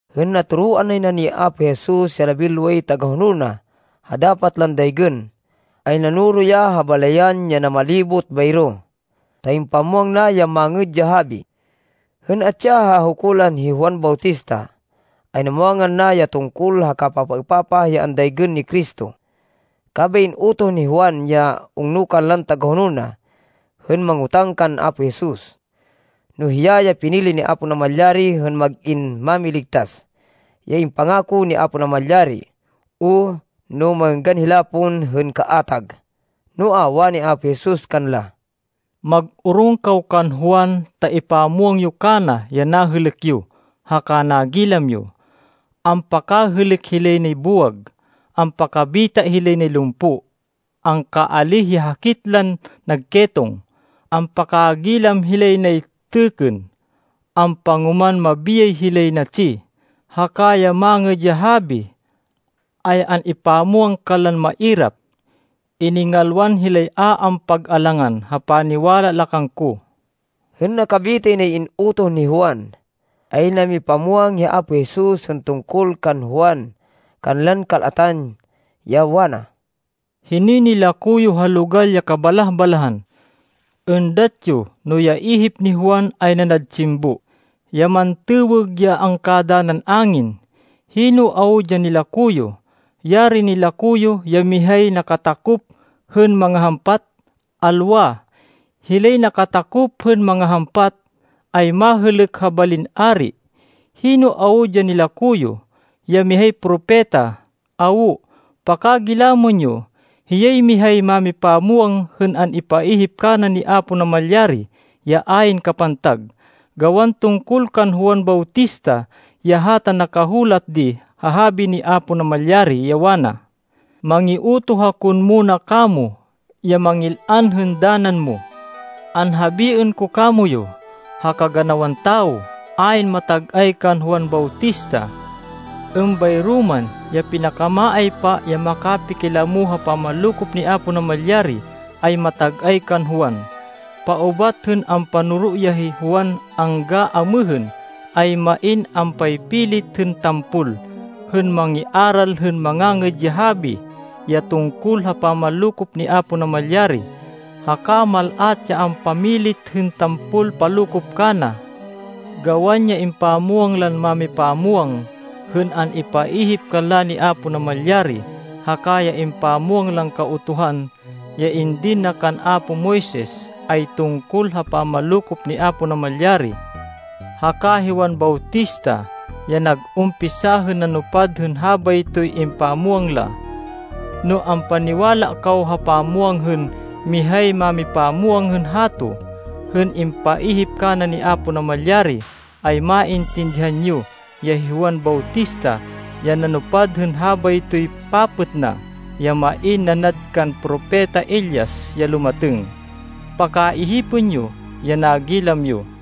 Hên natoroan nay na ni Apo Jesus ya labinloway tagahonol na ha dapat lan daygên, ay nanoro ya ha balayan ya namalibot bayro, ta impamwang na ya Mangêd ya Habi. Hên atsi ya ha hukulan hi Juan Bautista, ay namwangan na ya tungkol ha kapapaêpapah ya andaygên ni Cristo, kabay in-utoh ni Juan ya ungno kanlan tagahonol na hên mangotáng kan Apo Jesus, no hiya ya pinili ni Apo Namalyari hên mag-in Mámiligtas, ya impangako ni Apo Namalyari, o no mangênggan hila pon hên kaatag. Noa, wani Apo Jesus kanla, “Mag-orong kaw kan Juan ta ipamwang yo kana ya nahêlêk yo haka nagilam yo. Ampakahêlêk hilay nay buwag, ampakabita hilay nay lumpo, angkaalíh ya hakit lan nag ketong, ampakagilam hilay nay têkkên, ampangoman mabiyay hilay natsi, haka ya Mangêd ya Habi ay an-ipamwang kanlan mairap. Iningalwan hilay a ampag-alangan ha paniwala la kangko.” Hên nakabitay nay in-utoh ni Juan, ay namipamwang hi Apo Jesus hên tungkol kan Juan kanlan kal-atan, ya wana, “Hinoy nilako yo ha logal ya kabalah-balahan? Êndat yo no ya ihip ni Juan ay nanad tsimbo, ya mantêwêg ya angkadanan angin? Hino awud ya nilako yo? Yarin nilako yo ya mihay nakatakop hên mangahampat! Alwa! Hilay nakatakop hên mangahampat, ay mahêlêk ha balin ari. Hino awud ya nilako yo? Ya mihay propeta? Awo. Pakagilamên yo! Hiyay mihay mámipamwang hên an-ipaihip kana ni Apo Namalyari, ya ayn kapantag. Gawan tungkol kan Juan Bautista ya hata nakahulat di ha habi ni Apo Namalyari, ya wana, ‘Mangiutoh ako hên muna kamo ya mangil-an hên danan mo.’ Anhabiên ko kamoyu, ha kaganawan tawo, ayn matag-ay kan Juan Bautista. Êmbayro man, ya pinakamaaypa ya nakapakilamo ha pamanlokop ni Apo Namalyari, ay matag-ay kan Juan. Paubat hên ampanoro ya hi Juan anggan amêhên, ay main ampaypilit hên tampol hên mangiaral hên Mangangêd ya Habi ya tungkol ha pamanlokop ni Apo Namalyari, haka mal-at ya ampamilit hên tampol palokop kana. Gawan ya impamwang lan mámipamwang, hên an-ipaihip kanla ni Apo Namalyari, haka ya impamwang lan Kautuhan ya indin na kan apo Moises, ay tungkol ha pamanlokop ni Apo Namalyari. Haka hi Juan Bautista ya nag-umpisa hên nanupad hên habaytoy impamwang la. No ampaniwala kaw ha pamwang hên mihay mámipamwang hên hato, hên impaihip kana ni Apo Namalyari, ay maintindihan yo ya hi Juan Bautista, ya nanupad hên habaytoy papêt na, ya main nanad kan Propeta Elias ya lumatêng. Pakaihipên yo ya nagilam yo!”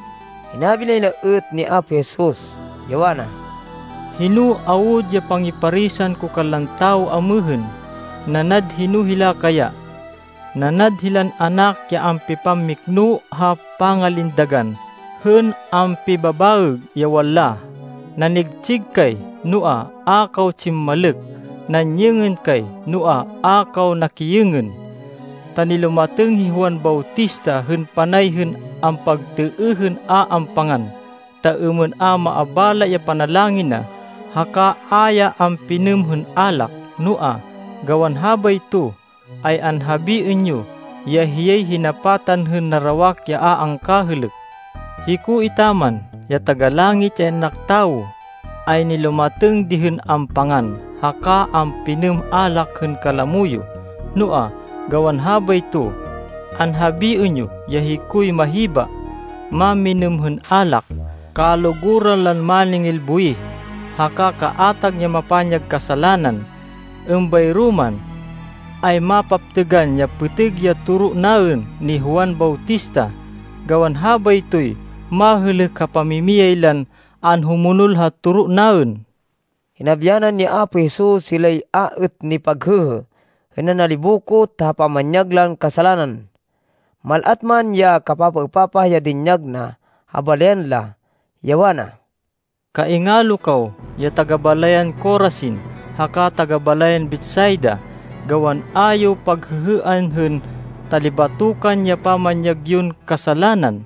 Hinabi nay na êt ni Apo Jesus, ya wana, “Hino awud ya pangiparisan ko kanlan tawo amêhên? Nanad hino hila kaya? Nanad hilan anak ya ampipammikno ha pangalindagan hên ampibabaêg, ya wanla, ‘Nanigtsig kay, noa, a kaw tsimmalêk. Nanyêngên kay, noa, a kaw nakiyêngên.’ Ta nilumatêng hi Juan Bautista hên panay hên ampagtêêh hên a ampangan, ta êmên a maabala ya panalangin na, haka a ya ampinêm hên alak, noa gawan habayto, ay anhabiên yo, ya hiyay hinapatan hên narawak ya a angkahêlêk. Hiko etaman, ya Taga-Langit, ya In-anak Tawo, ay nilumatêng di hên ampangan haka ampinêm alak hên kalamo yo, noa gawan habayto, anhabiên yo ya hikoy mahiba, mamminêm hên alak, kaluguran lan máningil buwih, haka kaatag ya mapanyag kasalanan. Êmbayro man, ay mapaptêgan ya pêtêg ya toro naên ni Juan Bautista, gawan habaytoy mahêlêk ha pamimiyay lan anhumonol ha toro naên.” Hinabyanan ni Apo Jesus hilay a êt nipaghêhê hên nanalibokot ha pamanyag lan kasalanan, mal-at man ya kapapaêpapah ya dinyag na ha balayan la, ya wana, “Kaingalo kaw ya taga-balayan Corazin haka taga-balayan Betsaida, gawan a yo paghêhêan hên talibatokan ya pamanyag yon kasalanan,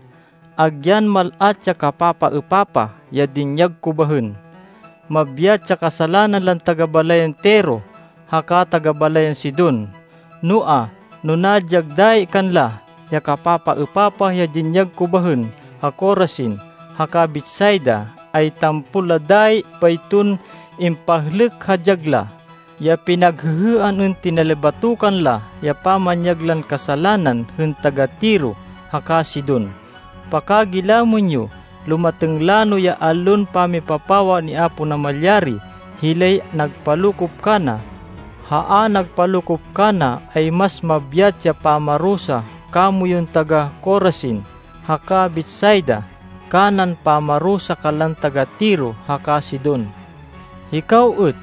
agyan mal-at ya kapapaêpapah ya dinyag ko bahên. Mabyat ya kasalanan lan taga-balayan Tiro haka taga-balayan Sidon. Noa, no nadyag dayi kanla, ya kapapaêpapah ya dinyag ko bahên ha Corazin, haka Betsaida, ay tampol la dayi bayton impahlêk ha dyag la ya pinaghêhêan hên tinalibatokan la ya pamanyag lan kasalanan hên taga-Tiro haka Sidon. Pakagilamên yo! Lumatêng lano ya allon pamipapawa ni Apo Namalyari hilay nagpalokop kana, ha a nagpalokop kana, ay mas mabyat ya pamarusa kamoyun taga-Corazin haka Betsaida kanan pamarusa kanlan taga-Tiro haka Sidon. Hikaw êt,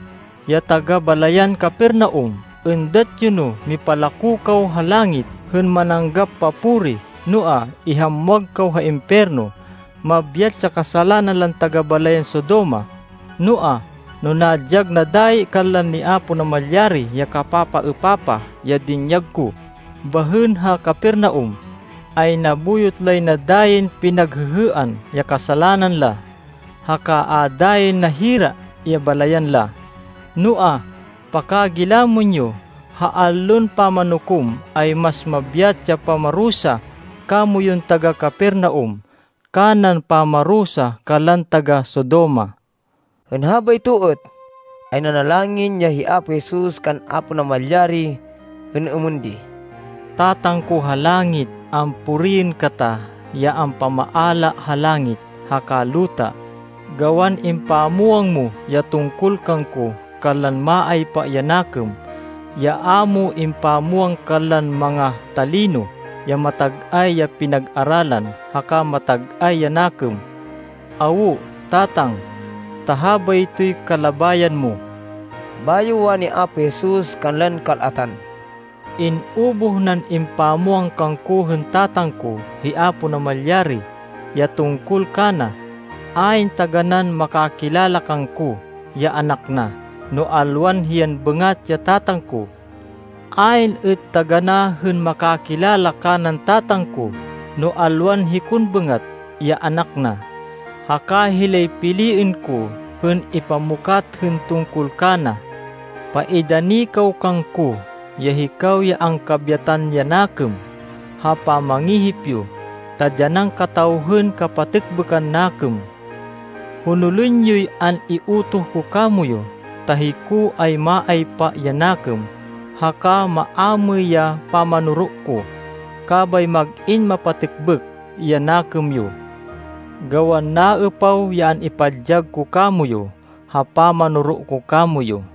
ya taga-balayan Capernaum, êndat yo no mipalako kaw ha langit hên mananggap papuri, noa, ihamwag kaw ha impiyerno. Mabyat ya kasalanan lan taga-balayan Sodoma, noa, no nadyag na dayi kanla ni Apo Namalyari ya kapapaêpapah ya dinyag ko bahên ha Capernaum, ay nabuyot lay na dayin pinaghêhêan ya kasalanan la, haka a dayin nahira ya balayan la. Noa, pakagilamên yo, ha Allon Pamanukom, ay mas mabyat ya pamarusa kamoyun taga-Capernaum, kanan pamarusa kanlan taga-Sodoma.” Hên habayto êt, ay nanalangin ya hi Apo Jesus kan Apo Namalyari hên êmên di, “Tatang ko ha langit, ampuriên kata, ya ampamaala ha langit haka luta, gawan impamwang mo ya tungkol kangko kanlan maaypa ya nakêm, ya a mo impamwang kanlan manga-talino ya matag-ay ya pinag-aralan haka matag-ay ya nakêm. Awo, Tatang, ta habaytoy kalabayan mo.” Bayo wani ni Apo Jesus kanlan kal-atan, “In-ubuh nan impamwang kangko hên Tatang ko, hi Apo Namalyari ya tungkol kana. Ayn taganán makakilala kangko, ya Anak na, no alwan hiyan bêngat ya Tatang ko. Ayn êt taganá hên makakilala kanan Tatang ko, no alwan hikon bêngat, ya Anak na, haka hilay piliên ko hên ipamukat hên tungkol kana. “Paidani kaw kangko, ya hikaw ya angkabyatan ya nakêm ha pamangihip yo, ta dyanan kataw hên kapatêkbêkan nakêm. Honolên yoy an-iutoh ko kamoyu, ta hiko ay maaypa ya nakêm haka maamêy ya pamanoro ko, kabay mag-in mapatêkbêk ya nakêm yo. Gawan naêpaw ya an-ipadyag ko kamoyu ha pamanoro ko kamoyu.”